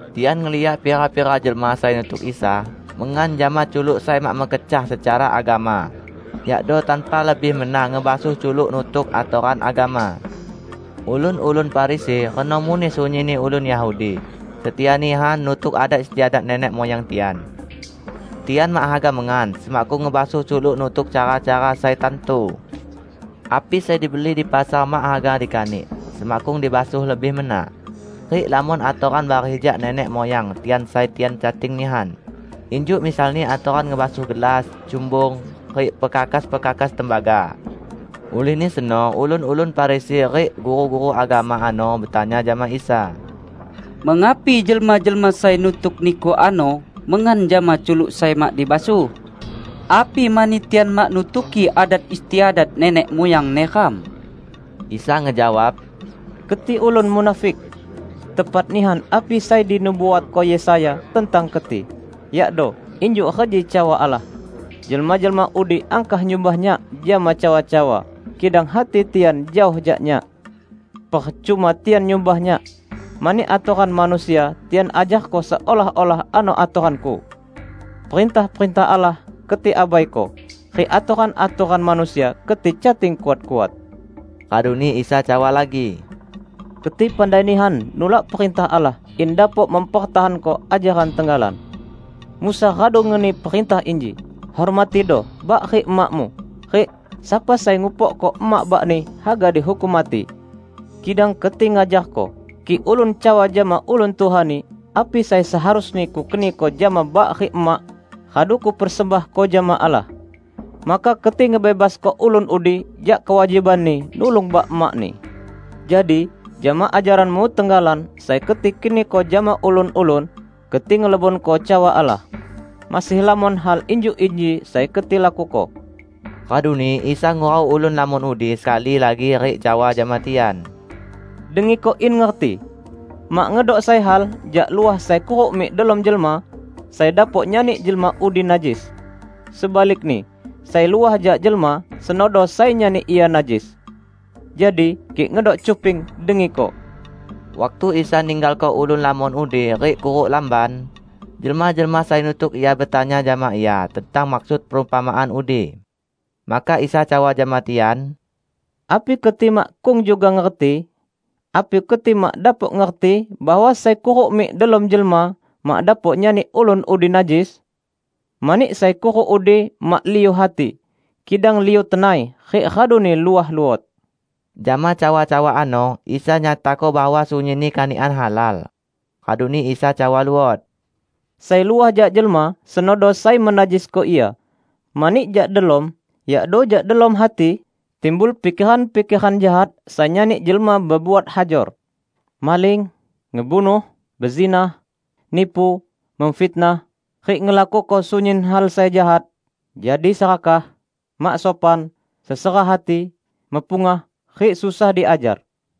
Tian ngeliak pira-pira jelma sai nutuk Isa mengan jama culuk sai mak mekecah secara agama, yakdo tanpa lebih mena ngebasuh culuk nutuk atoran agama. Ulun-ulun Farisi, reno muneh sunyinni ulun Yahudi, setia nihan nutuk adat istiadat nenek muyang tian. Tian mak haga mengan, semakkung ngebasuh culuk nutuk cara-cara sai tantu. Api sai dibeli di pasar mak haga dikanik, semakkung dibasuh lebih mena. Rik lamon atoran bareh jak nenek muyang tian sai tian cating nihan; injuk misalni atoran ngebasuh gelas, cumbung, rik pekakas-pekakas tembaga. Ulihni seno ulun-ulun Farisi rik guru-guru agama ano betanya jama Isa, "Mengapi jelma-jelma sai nutuk Niku ano mengan jama culuk sai mak dibasuh? Api mani tian mak nutuki adat istiadat nenek muyang neram?" Isa ngejawab, "Keti ulun munafik! Tepat nihan api sai dinubuatko Yesaya tentang keti, yakdo, 'Injuk reji cawa Allah, Jelma-jelma udi angkah nyumbah Nyak jama cawa-cawa, kidang hati tian jaoh jak Nyak. Percuma tian nyumbah Nyak, mani atoran manusia tian ajarko seolah-olah ano atoran-Ku!' Perintah-perintah Allah keti abaiko, rik atoran-atoran manusia keti cating kuat-kuat." Raduni Isa cawa lagi, "Keti pandai nihan nulak perintah Allah in dapok mempertahanko ajaran tenggalan. Musa radu ngeni perintah inji, 'Hormatido bak rik emakmu,' rik 'Sapa sai ngupokko emak bakni, haga dihukum mati.' Kidang keti ngajarko: Kik ulun cawa jama ulun tuhani, 'Api sai seharusni kukeniko jama bak rik emak, radu kupersembahko jama Allah,' maka keti ngebebasko ulun udi jak kewajibanni nulung bak emakni. Jadi jama ajaranmu tenggalan sai keti keniko jama ulun-ulun, keti ngelebonko cawa Allah. Masih lamon hal injuk inji sai keti lakuko." Raduni Isa ngurau ulun lamon udi sekali lagi rik cawa jama tian, "Dengiko in ngerti! Mak ngedok sai hal jak luah sai kuruk mik delom jelma sai dapok nyani jelma udi najis. Sebalikni, sai luah jak jelma, senodo sai nyani ia najis. [ Jadi, kik ngedok cuping, dengiko.]" Waktu Isa ninggalko ulun lamon udi rik kuruk lamban, jelma-jelma sai nutuk Ia betanya jama Ia tentang maksud perumpamaan udi. Maka Isa cawa jama tian, "Api keti makkung juga ngerti? Api keti mak dapok ngerti bahwa sai kuruk mik delom jelma mak dapok nyani ulun udi najis? Mani sai kuruk udi mak liu hati, kidang liu tenai, rik raduni luah luot." Jama cawa-cawa ano Isa nyatako bahwa sunyinni kanikan halal. Raduni Isa cawa luot, "Sai luah jak jelma, senodo sai menajisko ia. Mani jak delom, yakdo jak delom hati, timbul pikeran-pikeran jahat sai nyani jelma bebuat hajor, maling, ngebunuh, bezinah, nipu, memfitnah, rik ngelakuko sunyin hal sai jahat, jadi serakah, mak sopan, sesera hati, mepungah, rik susah diajar.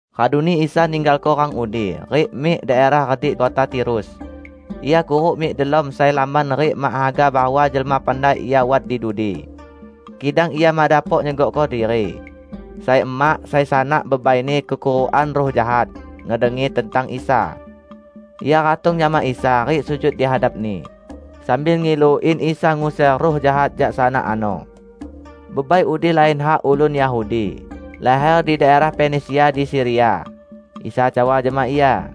Raduni Isa ninggalko rang udi, rik mik daerah redik kota Tirus. Ia kuruk mik delom sai lamban rik mak haga bahwa jelma pandai Ia wat di dudi. Kidang Ia mak dapok nyegokko diri. Sai emak, sai sanak bebaini kekurukan ruh jahat, ngedengi tentang Isa. Ia ratong jama Isa rik sujud di hadap-Ni, sambil ngilu in Isa nguser ruh jahat jak sanak ano. Bebai udi lain hak ulun Yahudi, laher di daerah Fenisia di Siria. Isa cawa jama ia,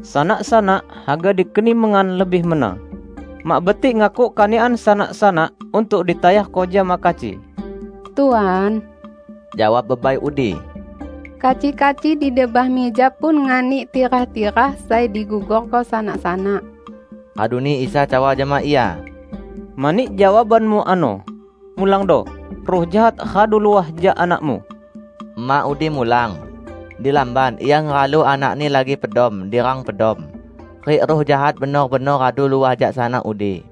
"Sanak-sanak haga dikeni mengan lebih mena. Mak betik ngakuk kanikan sanak-sanak untuk ditayarko jama kaci." "Tuan," jawab bebai udi, "kaci-kaci di debah mija pun nganik tirah-tirah sai digugorko sanak-sanak!" Raduni Isa cawa jama ia, "Mani jawabanmu ano, mulangdo; ruh jahat radu luah jak anakmu!" Emak udi mulang. Di lamban, ia ngehalu anakni lagi pedom di rang pedom, rik ruh jahat benor-benor radu luah jak sanak udi.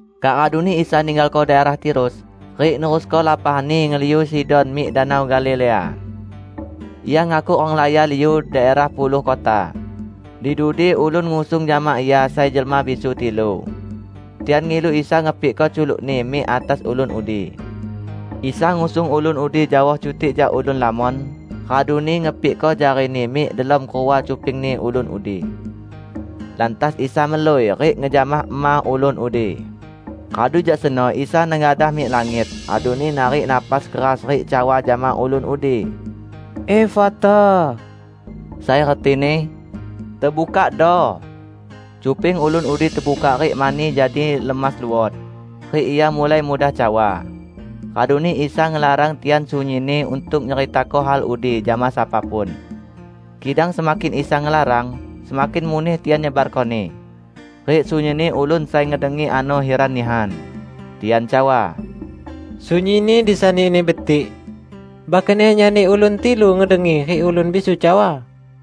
Kak raduni Isa ninggalko daerah Tirus, rik nerusko lapah-Ni ngeliu Sidon mik Danau Galilea. Ia ngakuk renglaya liu daerah Puluh Kota. Di dudi ulun ngusung jama Ia sai jelma bisu tilu. Tian ngilu Isa ngepikko culuk-Ni mik atas ulun udi. Isa ngusung ulun udi jaoh cutik jak ulun lamon, raduni ngepikko jari-Ni mik delom kerua cupingni ulun udi. Lantas Isa melui, rik ngejamah ema ulun udi. Radu jak seno Isa nengadah mik langit, raduni narik napas keras rik cawa jama ulun udi, "Efata," sai retini, "Tebukakdo!" Cuping ulun udi tebukak rik mani jadi lemas luot, rik ia mulai mudah cawa. Raduni Isa ngelarang tian sunyinni untuk nyeritako hal udi jama sapa pun. Kidang semakin Isa ngelarang, semakin muneh tian nyebarkoni. Rik sunyinni ulun sai ngedengi ano hiran nihan. Tian cawa, "Sunyinni disani-Ni betik! Bahkan Ia nyani ulun tilu ngedengi rik ulun bisu cawa!"